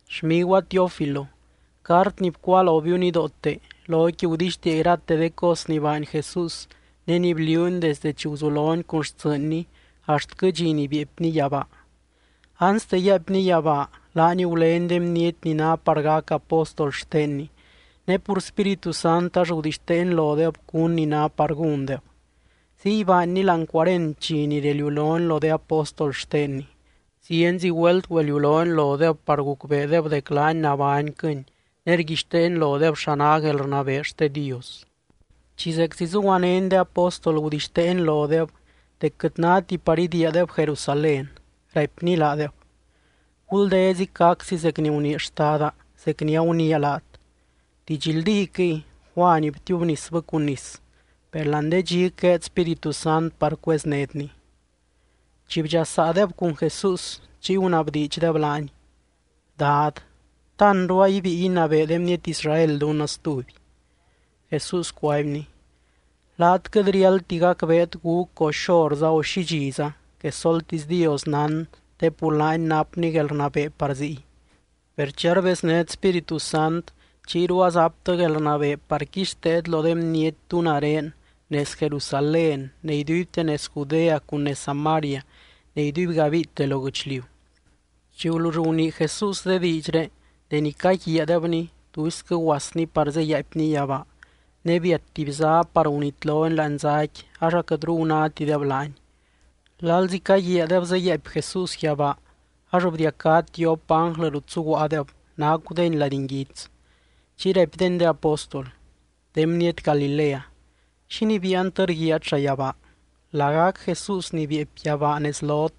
Xmiguaa Teófilo, cart ni bcuáa lobiu nidoote, loqui gudixtiia irate de cos ni baany Jesús ne ni bliuuny desde chi guzulony cun xtsɨɨnny axtquɨ dxi ni bieepny yabaa. Anste yaaipny yabaa, laany gulény de bniety ni ná par gac apóstol xtenny, ne pur Spíritu Sant ax gudixteeny lodeb cún ni ná par gúndeb. Ziy baanny láani cuarent dxi ni reliulony lo de apóstol xtenny. Zienzi güelt güeliulony lodeb par gucbeedeb dec laany nabányquɨny ne rguixteeny lodeb xa ná guelrnabee xte Dios. Chi zeczi zuguanény de apóstol gudixteeny lodeb dec quɨt náti par idiiadeb Jerusalén, raipny laadeb: —Guldezic gaczi zec ni gunii Xtada, zec ni aguniia laat. Didxldíquɨy, Juany btiubnisbɨ cun nis, per láani de dxic gueed Spíritu Sant par cueznétny. Chi bdxasaadeb cun Jesús, chiy gunabdiidxdeb laany: —Dad, ¿ta anru a ibíi inabee de bniety Israel dunnɨ stuby? Jesús cuaibny: —Laat quɨt riáldti gacbeet gúc o xorza o xi dxiza, quesoltisy Dios nán te pur laany napny guelrnabee par ziy. Per chi arbeznét Spíritu Sant, chiyru azaptɨ guelrnabee par quixteet lo de bniety tú nare nez Jerusalén ne iduibte nez Judea cun nez Samaria, ne iduibgabiite lo guɨchliu. Chi gulull gunii Jesús de diidxré deni caguiaadebny, tuisquɨ guasny par zeyaaipny yabaa. Ne biat tuby zá par gunitlony láani záqui ax aquɨtru gunátideb laany. Lalzi caguiaadeb zeyaaipy Jesús yabaa, ax bdiacá tiop ánglɨ rut zuguaadeb nacudeny lady nguits. Chiy raipdeny de apóstol: —De bniety Galilea, ¿xínii biiantɨ rguiaat llayabaa? Lagac Jesús ni bieepy yabaa nez lot,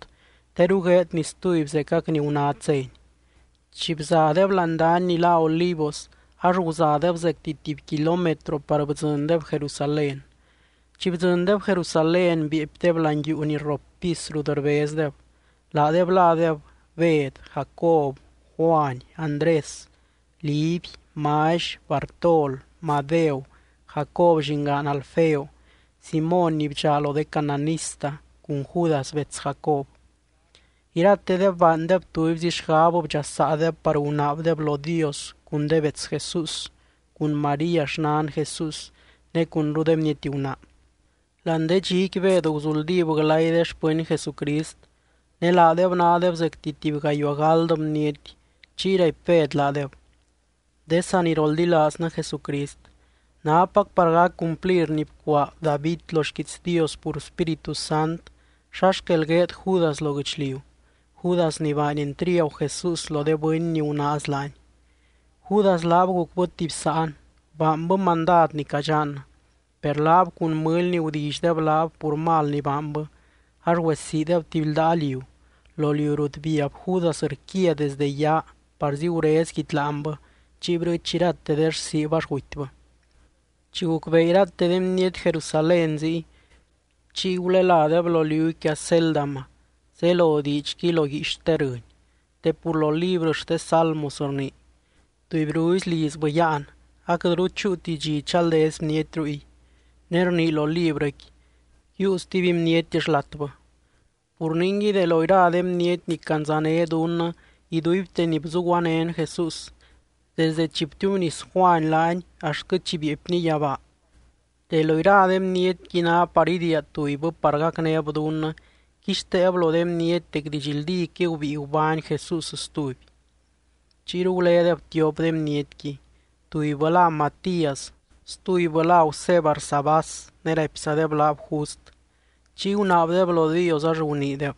teru gueedny stuby zecac ni gunát zény. Chi bzadeb láani dany ni lá Olivos, ax guzadeb zecti tuby kilómetro par bdzɨndeb Jerusalén. Chi bdzɨndeb Jerusalén, bieepydeb láani yuu ni rrop pis rut rbezdeb. Laadeb ládeb Bed, Jacob, Juany, Andrés, Liby, Mally, Bartol, Madeu, Jacob llingaan Alfeo, Simóny ni bdxaa lo de cananista, cun Judas bets Jacob. Iratedeb baandeb tubyzi xgab bdxasaadeb par gunaabdeb lo Dios cun de bets Jesús, cun María xnan Jesús ne cunru de bniety gunaa. Láani de dxiqui Bed guzuldíb glay de xpɨny Jesucrist. (Ne laadeb nádeb zecti tuby gayuaa gáld bniety.) Chiy raipy Bed laadeb: —De saniroldilaaznɨ Jesucrist, nápac par guc cumplir ni bcuaa David lo xquiits Dios pur Spíritu Sant xa xquel gueed Judas lo guɨchliu, Judas ni baany entriagu Jesús lo de bɨny ni gunaaz laany. Judas laab gucbɨ tuby sáan, baanbɨ mandad ni cadxannɨ. Per laab cun mɨly ni gudillydeb laab pur mal ni baanbɨ, ax güesiideb tuby ldaa liu, lo liu rut biab Judas rquia desdɨ yaa parzi gurez guidyláanbɨ chiy brɨɨch irate de rsiib ax gutybɨ. Chi gucbee irate de bniety Jerusalén ziy, chiy guleládeb lo liuqui Acéldama, zelo diidxqui lo guiix xte rɨny. Te pur lo librɨ xte Salmos rnii: Tubyruzi lizbɨ yáan, aquɨtru chúuti dxi chaldez bniety ruy. Ne rnii lo librɨqui: Yiiu stuby bniety xlatbɨ. ’Pur ningui de lo ira de bniety ni candzané dunnɨ iduibte ni bzuguanén Jesús, desde chi btiubnis Juany laany axtquɨ chi bieepny yabaa, de lo ira de bnietqui ná par idiia tubybɨ par gacnéb dunnɨ quixteeb lo de bniety dec didxldíquɨy gubíi gubány Jesús stuby. Chiyru gulédeb tiop de bnietqui. Tubybɨ lá Matías, stubybɨ lá Gusé Barsabás ne raipzadeb laab Just. Chiy gunaabdeb lo Dios ax guniideb: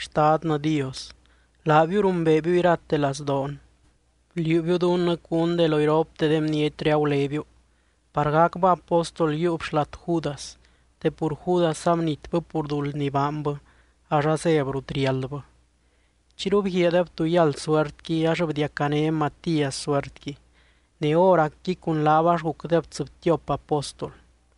—Xtadnɨ Dios, laabiu rumbeebiu irate lazdoon. Bliuubiu dunnɨ cún de lo iropte de bnietré agulébiu par gacbɨ apóstol yiiub xlat Judas te pur Judas abnitbɨ pur duld ni baanbɨ, ax azéb rut riáldbɨ. Chiyru bguiaadeb tú yáld suertqui, ax bdiacané Matías suertqui. Ne hóracqui cun laab ax gucdeb tsɨbtiop apóstol.